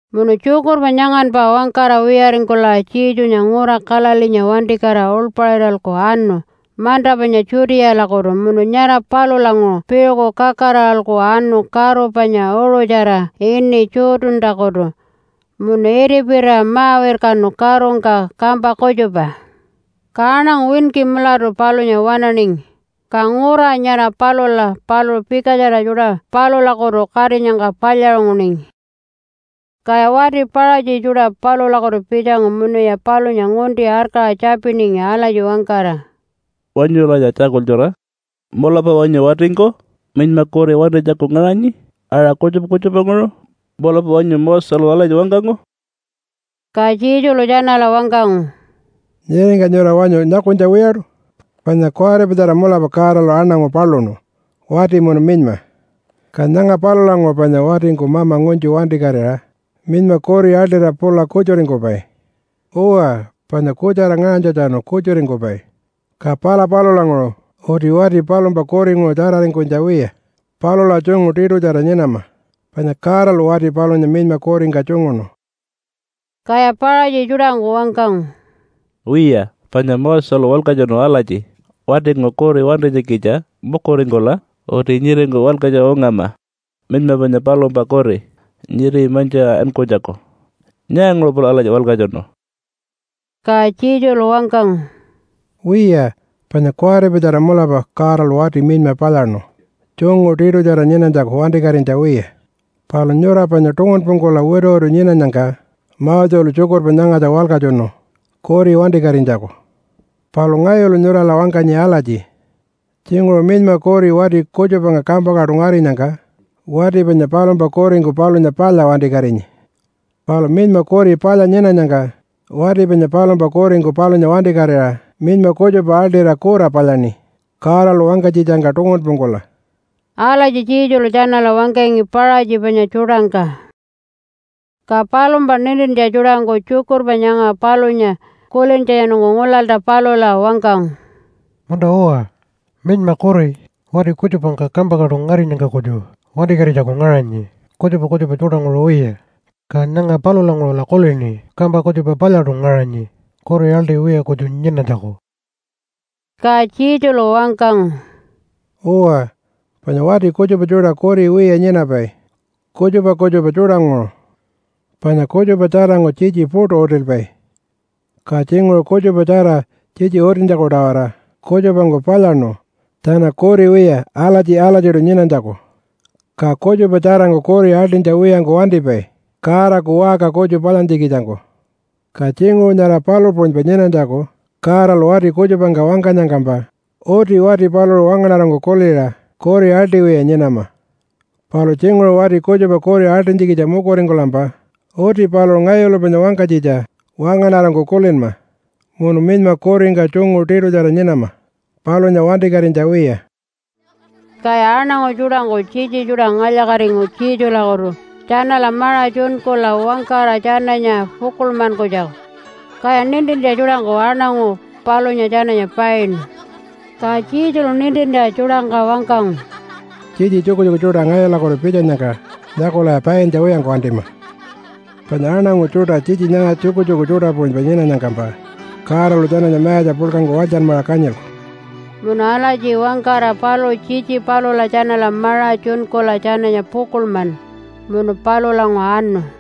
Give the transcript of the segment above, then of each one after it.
Munu tjukurpa nyanganpa wangkara wiyaringkula Jesunya ngura Galileenya wantikatira uḻpaṟiralku anu manta panya Judealakutu munu nyara palulanguṟu piṟuku kakaraṟa anu karu panya uṟutjara ini Jordantakutu munu itipirira ma-wirkanu karungka kampa kutjupa. Ka aṉangu winki mulatu palunya waṉaningi, ka ngura nyara palula paluṟu pikatjara tjuṯa palulakutu katinyangka palyaṟunguningi. Kaya wati Paṟatji tjuṯa palulakutu pitjangu munuya palunya ngunti arkaṟa tjapiningi alatji wangkara, “Wanyulanya tjakultjura! Mulapa wanyu watingku minyma kuri wantinytjaku ngaṟanyi aṟa kutjupa kutjupanguṟu? Mulapa wanyu Moselu alatji wangkangu?” Ka Jesulu tjanala wangkangu, “Nyiringka nyura wanyu nyakunytja wiyaṯu? Panya kuwaripatjara mulapa Godalu aṉangu paluṉu wati munu minyma. Ka nyanga palulanguṟu panya watingku mama ngunytju wantikatira minyma kuri aḻṯira pula kutjuringkupai. Uwa, panya kutjara ngaṟanytjatjanu kutjuringkupai, ka pala palulanguṟu uti wati palumpa kuringuṟu tjararingkunytja wiya palula tjungu tiṯutjara nyinama, panya Godalu wati palunya minyma kuringka tjunguṉu.” Kaya Paṟatji tjuṯangku wangkangu, “Wiya, panya Moselu walkatjunu alatji, ‘Watingku kuri wantinytjikitja mukuringkula uti nyiringka walkatjuṟa ungama minyma panya palumpa kuri nyiri mantjiṟa ankunytjaku.’ Nyaanguṟu paluṟu alatji walkatjunu?” Ka Jesulu wangkangu, “Wiya, panya kuwaripatjara mulapa Godalu wati minyma palyaṉu tjungu tiṯutjara nyinanytjaku wantikatinytja wiya. Palu nyura panya tungunpungkula wituwitu nyinanyangka Moselu tjukurpa nyangatja walkatjunu kuri wantikatinytjaku. Palu ngayulu nyurala wangkanyi alatji tjinguṟu minyma kuri wati kutjupangka kampangkaṯu ngarinyangka wati panya palumpa kuringku palunya palya wantikatinyi. Palu minyma kuri palya nyinanyangka wati panya palumpa kuringku palunya wantikatira minyma kutjupa aḻṯira kura palyaṉi Godalu wangkanytjitjangka tungunpungkula.” Alatji Jesulu tjanala wangkangi Paṟatji panya tjuṯangka. Ka palumpa nintintja tjuṯangku tjukurpa nyanga palunya kulintjatjanungku ngulalta palula wangkangu, “Munta-uwa, minyma kuri wati kutjupangka kampangkaṯu ngarinyangka kutju wantikatinytjaku ngaṟanyi kutjupa kutjupa tjuṯanguṟu wiya, ka nyanga palulanguṟula kulini kampa kutjupa palyaṯu ngaṟanyi kuri aḻṯiwiya kutju nyinanytjaku.” Ka Jesulu wangkangu, “Uwa, panya wati kutjupa tjuṯa kuri wiya nyinapai kutjupa kutjupa tjuṯanguṟu. Panya kutjupa tjarangku tjitji puṯu utilpai, ka tjinguṟu kutjupatjara tjitji utintjaku-tawara kutjupangku palyaṉu tjana kuri wiya alatji-alatjiṯu nyinanytjaku. Ka kutjupa tjarangku kuri aḻṯinytja wiyangku wantipai Godaku waṟka kutju palyantjikitjangku. Ka tjinguṟu nyara palu puṟunypa nyinanytjaku Godalu wati kutjupangka wangkanyangkampa uti wati paluṟu wangaṉarangku kuliṟa kuri aḻṯiwiya nyinama. Palu tjinguṟu wati kutjupa kuri aḻṯinytjikitja mukuringkulampa uti paluṟu ngayulu panya wangkanytjitja wangaṉarangku kulinma munu minyma kuringka tjungu tiṯutjara nyinama palunya wantikatinytja wiya.” Kaya aṉangu tjuṯangku tjitji tjuṯa ngalya-katingu Jesulakutu tjanala maṟa tjunkula wangkara tjananya pukuḻmanytjaku. Kaya nintintja tjuṯangku aṉangu palunya tjananya painu. Ka Jesulu nintintja tjuṯangka wangkangu, “Tjitji tjukutjuku tjuṯa ngayulakutu pitjanyangka nyakulaya paintja wiyangku wantima! Panya aṉangu tjuṯa tjitji nyanga tjukutjuku tjuṯa puṟunypa nyinanyangkampa Godalu tjananya mayatja puḻkangku walytjanmaṟa kanyilku.” Munu alatji wangkara paluṟu tjitji palula tjanala maṟa tjunkula tjananya pukuḻmanu, munu palulanguṟu anu.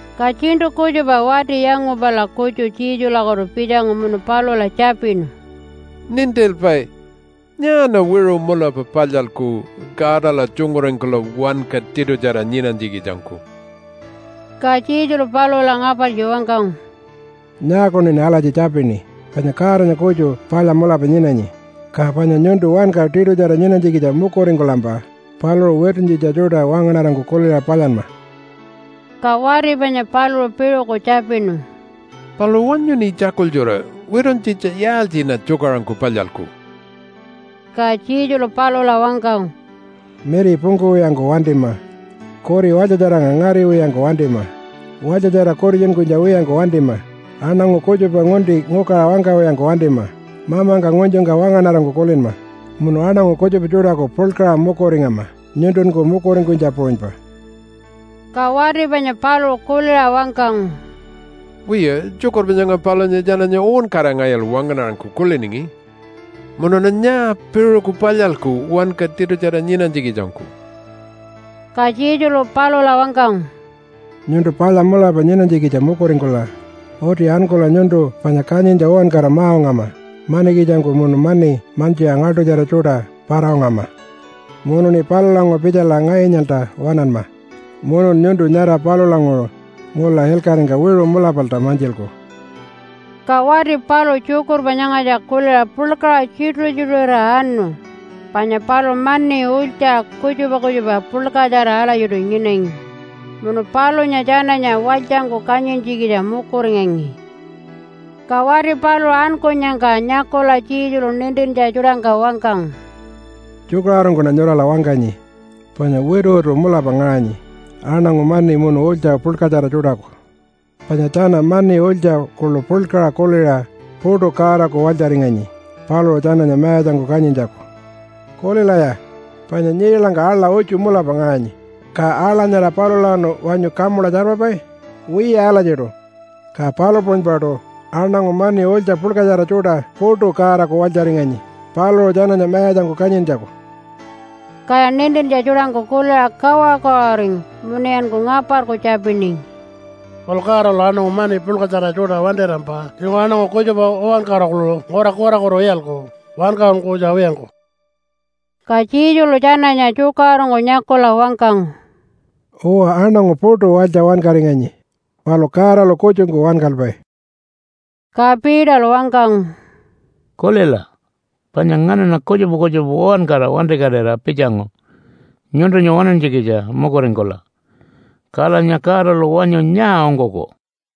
Ka tjiṉṯu kutjupa wati yangupala kutju Jesulakutu pitjangu munu palula tjapinu, “Nintilpai! Nyaaṉa wiṟu mulapa palyalku Godala tjunguringkula wanka tiṯutjara nyinanytjikitjangku?” Ka Jesulu palula ngapartji wangkangu, “Nyaakuṉin alatji tjapini? Panya Godanya kutju palya mulapa nyinanyi. Ka panya nyuntu wanka tiṯutjara nyinanytjikitja mukuringkulampa paluṟu wituntjitja tjuṯa wangaṉarangku kuliṟa palyanma.” Ka wati panya paluṟu piṟuku tjapinu, “Palu wanyuṉi tjakultjura, wituntjitja yaaltjiṉa tjukaṟurungku palyalku?” Ka Jesulu palula wangkangu, “Miri pungkuwiyangku wantima, kuri walytjatjarangka ngariwiyangku wantima, walytjatjara kutitjunkunytja wiyangku wantima, aṉangu kutjupa ngunti ngukaṟa wangkawiyangku wantima, mamangka ngunytjungka wangaṉarangku kulinma, munu aṉangu kutjupa tjuṯaku puḻkaṟa mukuringama nyuntunku mukuringkunytja puṟunypa.” Ka wati panya paluṟu kuliṟa wangkangu, “Wiya, tjukurpa nyanga palunya tjananya uwankara ngayulu wangaṉarangku kuliningi. Munuṉa nyaa piṟuku palyalku wanka tiṯutjara nyinanytjikitjangku?” Ka Jesulu palula wangkangu, “Nyuntu palya mulapa nyinanytjikitja mukuringkula uti ankula nyuntu panya kanyintja uwankara ma-ungama manikitjangku munu mani mantjiṟa ngaḻṯutjara tjuṯa para-ungama, munuṉi palulanguṟu pitjala ngayunyalta waṉanma. Munun nyuntu nyara palulanguṟu ngula ilkaṟingka wiṟu mulapalta mantjilku.” Ka wati paluṟu tjukurpa nyangatja kuliṟa puḻkaṟa tjituṟu-tjituṟurira anu, panya paluṟu mani ulytja kutjupa kutjupa puḻkatjara alatjiṯu nyinangi, munu palunya tjananya walytjangku kanyintjikitja mukuringangi. Ka wati paluṟu ankunyangka nyakula Jesulu nintintja tjuṯangka wangkangu, “Tjukaṟurungkuṉa nyurala wangkanyi, panya wituwitu mulapa ngaṟanyi aṉangu mani munu ulytja puḻkatjara tjuṯaku, panya tjana mani ulytja kuḻu puḻkaṟa kuliṟa puṯu Godaku walytjaringanyi paluṟu tjananya mayatjangku kanyintjaku. Kulilaya! Panya nyiilangka aḻa utju mulapa ngaṟanyi. Ka aḻa nyara palulawanu wanyu kamula tjarpapai? Wiya alatjiṯu. Ka palu puṟunypaṯu aṉangu mani ulytja puḻkatjara tjuṯa puṯu Godaku walytjaringanyi paluṟu tjananya mayatjangku kanyintjaku.” Kaya nintintja tjuṯangku kuliṟa kawaṟu-kawaṟuringu munuyanku ngaparku tjapiningi, “Palu Godalu aṉangu mani puḻkatjara tjuṯa wantirampa tjinguṟu aṉangu kutjupa uwankara kuḻu ngura kurakutu iyalku wankaṟunkunytja wiyangku.” Ka Jesulu tjananya tjukaṟurungku nyakula wangkangu, “Uwa, aṉangu puṯu walytja wankaringanyi, palu Godalu kutjungku wankalpai.” Ka Peterlu wangkangu, “Kulila, panya nganaṉa kutjupa kutjupa uwankara wantikatira pitjangu nyuntunya waṉantjikitja mukuringkula. Kalanya Godalu wanyu nyaa ungkuku?”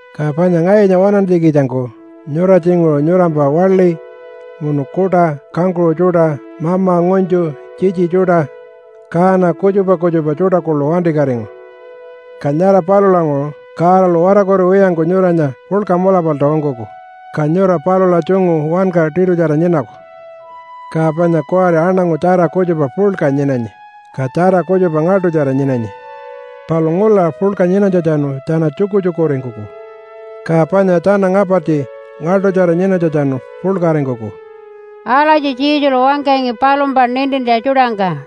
Ka panya ngayunya waṉantjikitjangku nyura tjinguṟu nyurampa waḻi, munu kuṯa, kangkuṟu tjuṯa, mama, ngunytju, tjitji tjuṯa, kaana kutjupa kutjupa tjuṯa kuḻu wantikatingu. Ka nyara palulanguṟu Godalu watarkuriwiyangku nyuranya puḻka mulapalta ungkuku, ka nyura palula tjungu wanka tiṯutjara nyinaku. Ka panya kuwari aṉangu tjara kutjupa puḻka nyinanyi, ka tjara kutjupa ngaḻṯutjara nyinanyi. Palu ngula puḻka nyinanytjatjanu tjana tjukutjukuringkuku, ka panya tjana ngapartji ngaḻṯutjara nyinanytjatjanu puḻkaringkuku.” Alatji Jesulu wangkangi palumpa nintintja tjuṯangka.